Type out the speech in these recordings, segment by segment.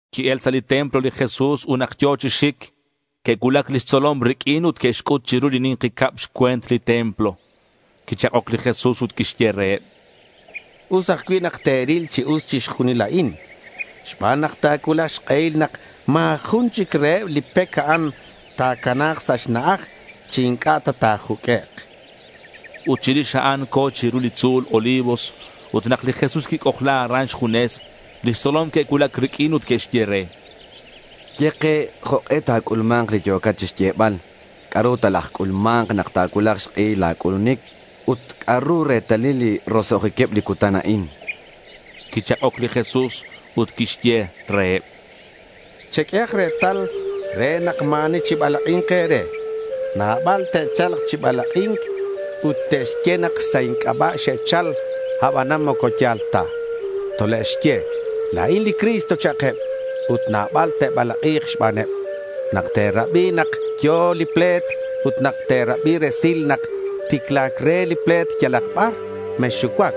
Qui-el sa' li templo li Jesús, ut nak yo̱ chi xic, que'cuulac lix tzolom riq'uin ut que'xc'ut chiru li ni̱nki cab xcue̱nt li templo. Quichak'oc li Jesús ut quixye reheb: —Us ajcui' nak te̱ril chi us chixjunil a'in xban nak ta̱cuulak xk'ehil nak ma̱ jun chic reheb li pec a'an ta̱cana̱k sa' xna'aj chi inc'a' ta ta̱juq'uek', chan. Ut chirix a'an, co̱ chiru li tzu̱l Olivos ut nak li Jesús quic'ojla aran xjunes, lix tzolom que'cuulac riq'uin ut que'xye re: —Ye ke jok'e ta̱c'ulma̱nk li yo̱cat chixyebal. ¿C'a'ru talajc'ulma̱nk nak ta̱cuulak xk'ehil la̱ c'ulunic? Ut ¿c'a'ru retalil li roso'jiqueb li cutan a'in?— Quichak'oc li Jesús ut quixye reheb: —Cheq'uehak retal re nak ma̱ ani chibalak'i̱nk e̱re. Nabal te'cha̱lk chi balak'i̱nc, ut te'xye nak sa' inc'aba' xe'chal, abanan moco ya̱l ta. Tole'xye, “La̱in li Cristo”, cha'keb. Ut nabal te'balak'i̱k xbaneb. Nak te̱rabi nak yo̱ li ple̱t ut nak te̱rabi resil nak ticla̱c re li ple̱t yalak bar, mexxucuac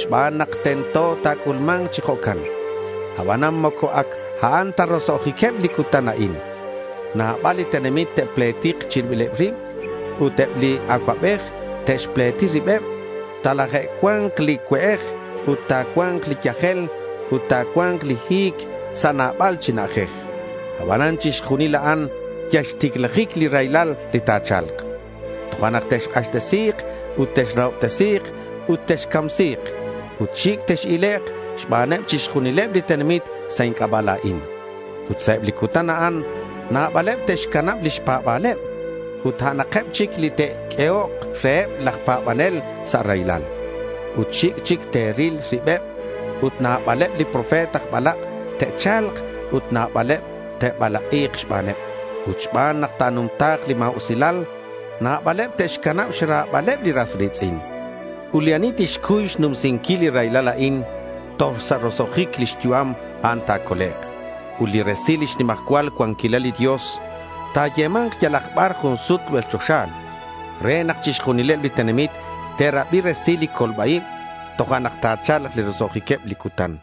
xban nak tento nak ta̱c'ulma̱nk chi jo'can. Abanan moco ac a'an ta roso'jiqueb li cutan a'in. Nabal li tenamit te'pletik chi ribileb rib. Ut eb li acuabej te'xpleti ribeb. Talajcua̱nk li cue'ej ut ta̱cua̱nk li yajel ut ta̱cua̱nk li hi̱c sa' nabal chi na'ajej. Abanan chixjunil a'an yal xticlajic li raylal li ta̱cha̱lk. Tojo'nak texk'axtesi̱k ut texrahobtesi̱k ut texcamsi̱k. Ut xic' tex-ilek' xbaneb chixjunileb li tenamit sa' inc'aba' la̱in. Ut sa' eb li cutan a'an nabaleb te'xcanab lix pa̱ba̱leb. Ut a'anakeb chic li te'q'uehok reheb laj pa̱banel sa' raylal. Ut xic' chic te'ril ribeb. Ut nabaleb li profeta aj balak' te'cha̱lk ut nabaleb te'balak'i̱k xbaneb. Ut xban nak ta̱numta̱k li ma̱usilal, nabaleb te'xcanab xra̱baleb li ras ri̱tz'in. Ut li ani tixcuy xnumsinquil li raylal a'in toj sa' roso'jic lix yu'am, a'an ta̱colek'. Ut li resil lix nimajcual cuanquilal li Dios ta̱yema̱nk yalak bar jun sut rubel choxa re nak chixjunileb li tenamit te'rabi resil li colba-ib. Tojo'nak ta̱cha̱lk li roso'jiqueb li cutan.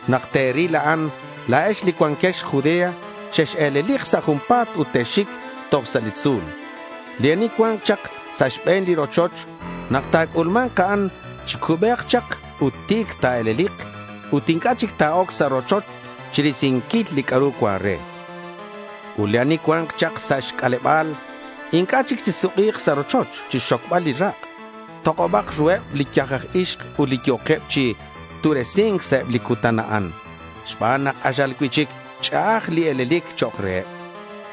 Nak te̱ril a'an, la̱ex li cuanquex Judea, chex-e̱lelik sa' junpa̱t ut texxic toj sa' li tzu̱l. Li ani cua̱nk chak sa' xbe̱n li rochoch nak ta̱c'ulma̱nk a'an, chi cubec chak ut ti̱c ta̱e̱lelik ut inc'a' chic ta̱oc sa' rochoch chirisinquil li c'a'ru cuan re. Ut li ani cua̱nk chak sa' xc'aleba̱l inc'a' chic chisuk'i̱k sa' rochoch chixxocbal li rak'. Tok'obak ruheb li yaj aj ixk ut li yo̱queb chi tu'resi̱nk sa' eb li cutan a'an xban nak k'axal cui'chic ch'a'aj li e̱lelic chok' reheb.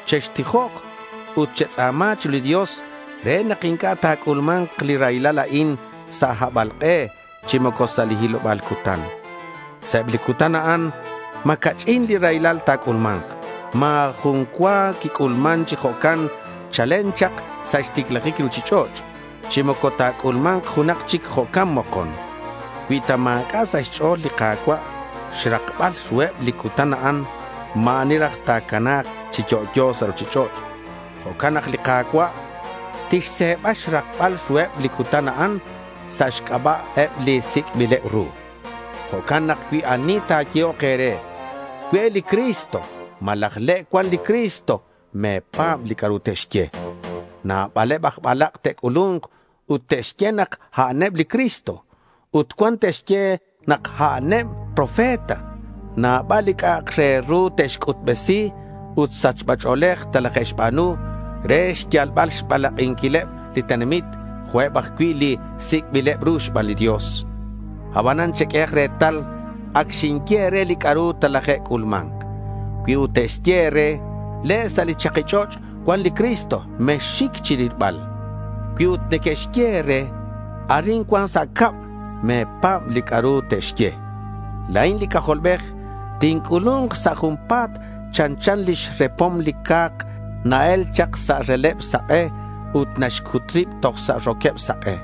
Chextijok ut chetz'a̱ma chiru li Dios re nak inc'a' ta̱c'ulma̱nk li raylal a'in sa' habalk'e chi moco sa' li hiloba̱l cutan. Sa' eb li cutan a'an ma̱ ca'ch'in li raylal ta̱c'ulma̱nk. Ma̱ jun cua quic'ulman chi jo'can chalen chak sa' xticlajic li ruchich'och', chi moco ta̱c'ulma̱nk junak chic jo'can mokon. Cui ta ma̱c'a' sa' xch'o̱l li Ka̱cua' xrakbal ruheb li cutan a'an, ma̱ ani raj ta̱cana̱k chi yo'yo sa' ruchich'och'. Jo'can nak li Ka̱cua' tixse̱ba xrakbal ruheb li cutan a'an sa' xc'aba'eb li sic'bileb ru. Jo'can nak cui ani ta̱yehok e̱re, “Cue' li Cristo,” malaj, “le' cuan li Cristo,” me̱pa̱b li c'a'ru tixye. Nabaleb aj balak' te'c'ulu̱nk ut te'xye nak a'aneb li Cristo. Ut cuan te'xye nak a'aneb profeta. Nabal li c'a'ak re ru te'xc'utbesi ut sachba ch'o̱lej telaje'xba̱nu re xyalbal xbalak'inquileb li tenamit, jo'queb ajcui' li sic'bileb ru xban li Dios. Abanan cheq'uehak retal. Ac xinye e̱re li c'a'ru talaje'c'ulma̱nk. Cui ut neque'xye e̱re, “Le' sa' li chaki ch'och' cuan li Cristo,” mexxic chirilbal. Cui ut neque'xye e̱re, “Arin cuan sa' cab,” me̱pa̱b li c'a'ru te'xye. La̱in li C'ajolbej tinc'ulu̱nk sa' junpa̱t. Chanchan lix repom li ca̱k na-el chak sa' releb sak'e ut naxc'ut rib toj sa' roqueb sak'e.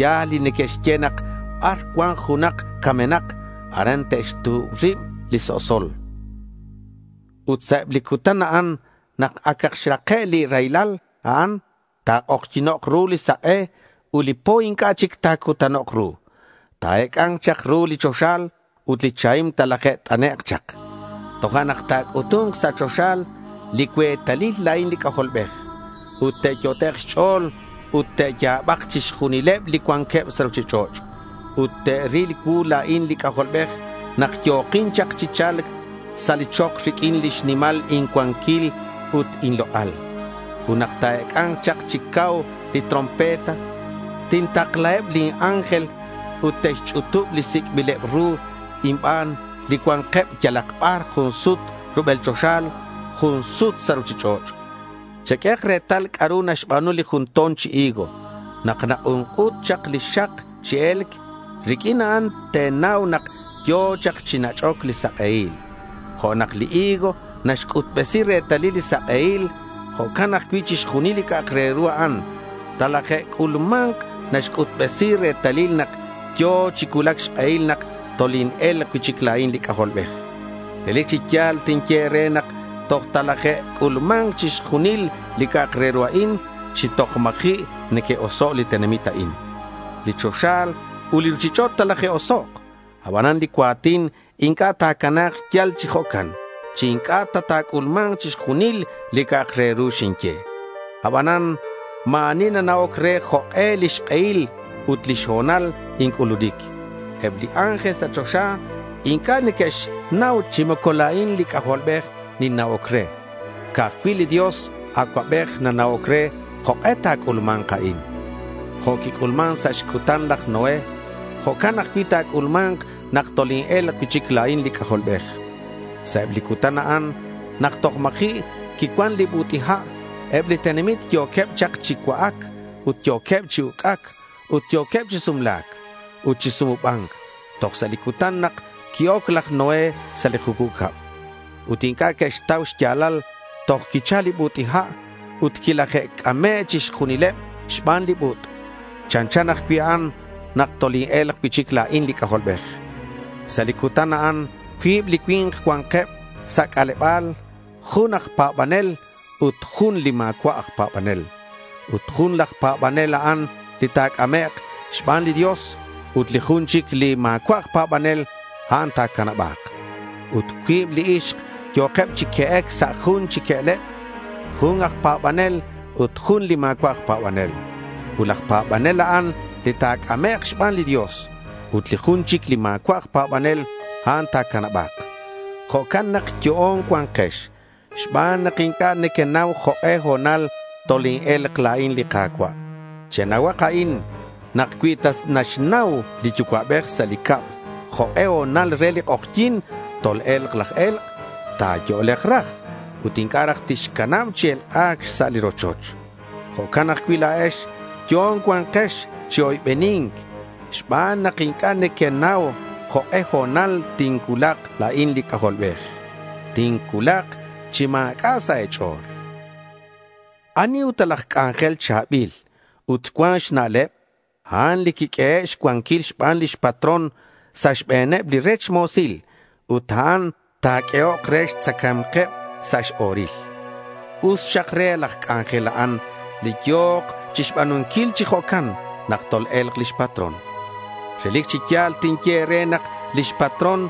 Ya̱l li neque'xye nak bar cua̱nk junak camenak, aran te'xtu̱b rib li so'sol. Ut sa' eb li cutan a'an nak acak xrake' li raylal a'an, ta̱k'ojyi̱nok' ru li sak'e ut li po inc'a' chic ta̱cutanok' ru. Ta̱ec'a̱nk chak ru li choxa ut li chahim talaje't'anek' chak. Tojo'nak ta̱c'utu̱nk sa' choxa li cuetalil la̱in li C'ajolbej. Ut te'yot'ek' ut te'ya̱bak chixjunileb li cuanqueb sa' ruchich'och'. Ut te'ril cuu la̱in li C'ajolbej nak yo̱kin chak chi cha̱lc sa' li chok riq'uin lix nimal incuanquil ut inlok'al. Ut nak ta̱ec'a̱nk chak chi cau li trompeta, tintaklaheb lin ángel. Ut te'xch'utub li sic'bileb ru inban li cua̱nkeb yalak bar jun sut rubel choxa jun sut sa' ruchich'och'. Cheq'uehak retal c'a'ru naxba̱nu li jun to̱n chi higo. Nak nak'unk'ut chak li xak chi e̱lc, riq'uin a'an te̱nau nak yo̱ chak chi nach'oc li sak'ehil. Jo' nak li higo naxc'utbesi retalil li sak'ehil, jo'can ajcui' chixjunil li c'a'ak re ru a'an talaje'c'ulma̱nk, naxc'utbesi retalil nak yo̱ chi cuulac xk'ehil nak toline̱lk cui'chic la̱in li C'ajolbej. Relic chi ya̱l tinye e̱re nak toj talaje'c'ulma̱nk chixjunil li c'a'ak re ru a'in chi toj ma̱ji' neque'oso' li tenamit a'in. Li choxa ut li ruchich'och' talaje'osok'. Abanan li cua̱tin inc'a' ta̱cana̱k yal chi jo'can chi inc'a' ta ta̱c'ulma̱nk chixjunil li c'a'ak re ru xinye. Abanan ma̱ ani nana'oc re jok'e lix k'ehil ut lix ho̱nal inc'ulunic. Eb li ángel sa' choxa inc'a' neque'xnau chi moco la̱in li C'ajolbej ninna'oc re. Ca'aj cui' li Dios Acuabej nana'oc re jok'e ta̱c'ulma̱nk a'in. Jo' quic'ulman sa' xcutan laj Noé, jo'can ajcui' ta̱c'ulma̱nk nak toline̱lk cui'chic la̱in li C'ajolbej. Sa' eb li cutan a'an nak toj ma̱ji' quicuan li but'i ha', eb li tenamit yo̱queb chak chi cua'ac ut yo̱queb chi uc'ac, ut yo̱queb chi sumla̱c ut chi sumuba̱nc toj sa' li cutan nak qui-oc laj Noé sa' li jucub cab. Ut inc'a' que'xtau xya̱lal toj quichal li but'i ha' ut quilaje'c'ame' chixjunileb xban li but'. Chanchan ajcui' a'an nak toline̱lk cui'chic la̱in li C'ajolbej. Sa' li cutan a'an cuib li cui̱nk cua̱nkeb sa' c'aleba̱l, jun aj pa̱banel ut jun li ma̱cua' aj pa̱banel. Ut laj pa̱banel, a'an li ta̱c'amek' xban li Dios ut li jun chic li ma̱cua' aj pa̱banel, a'an ta̱canaba̱k. Ut cuib li ixk yo̱keb chi que'ec sa' jun chi que'leb, jun aj pa̱banel ut jun li ma̱cua' aj pa̱banel. Ut laj pa̱banel, a'an li ta̱c'amek' xban li Dios ut li jun chic li ma̱cua' aj pa̱banel, a'an ta̱canaba̱k. Jo'can nak yo'on cua̱nkex xban nak inc'a' nequenau jok'e ho̱nal toline̱lk la̱in li Ka̱cua'. Chenauhak a'in: nak cui ta naxnau li yucua'bej sa' li cab jok'e ho̱nal re li k'ojyi̱n tol-e̱lk laj e̱lk', ta̱yo'lek raj ut inc'a' raj tixcanab chi elk'ac xsa' li rochoch. Jo'can ajcui' la̱ex yo'on cua̱nkex chi oybeni̱nc xban nak inc'a' nequenau jok'e ho̱nal tincuulak la̱in li C'ajolbej. Tincuulak chi ma̱c'a' sa' e̱ch'o̱l. ¿Ani ut laj c'anjel cha̱bil ut cuan xna'leb? A'an li quiq'uehe' xcuanquil xban lix patrón sa' xbe̱neb li rech mo̱sil ut a'an ta̱q'uehok re xtzacae̱mkeb sa' x-o̱ril. Us xak re laj c'anjel a'an li yo̱k chixba̱nunquil chi jo'can nak tol-e̱lk lix patrón. Relic chi ya̱l tinye e̱re nak lix patrón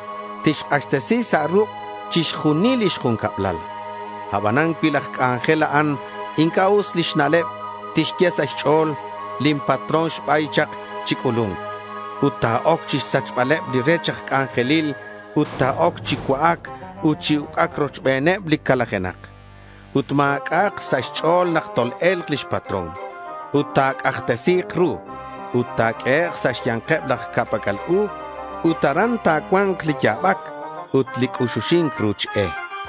tixk'axtesi sa' ruk', chixjunil lix juncablal. Aban cui laj c'anjel a'an inc'a' us lix na'leb, tixye sa' xch'o̱l, “Lin patrón ta̱ba̱yk chak chi c'ulu̱nc.” Ut ta̱oc chixsac'baleb li rech aj c'anjelil, ut ta̱oc chi cua'ac ut chi uc'ac rochbeneb li calajenak. Ut ma̱c'a'ak sa' xch'o̱l nak tol-e̱lk lix patrón. Ut ta̱c'ajtesi̱k ru ut ta̱q'uehek' sa' xya̱nkeb laj ca'pac'al u. Ut aran ta̱cua̱nk li ya̱bac ut li c'uxuxi̱nc ruch e.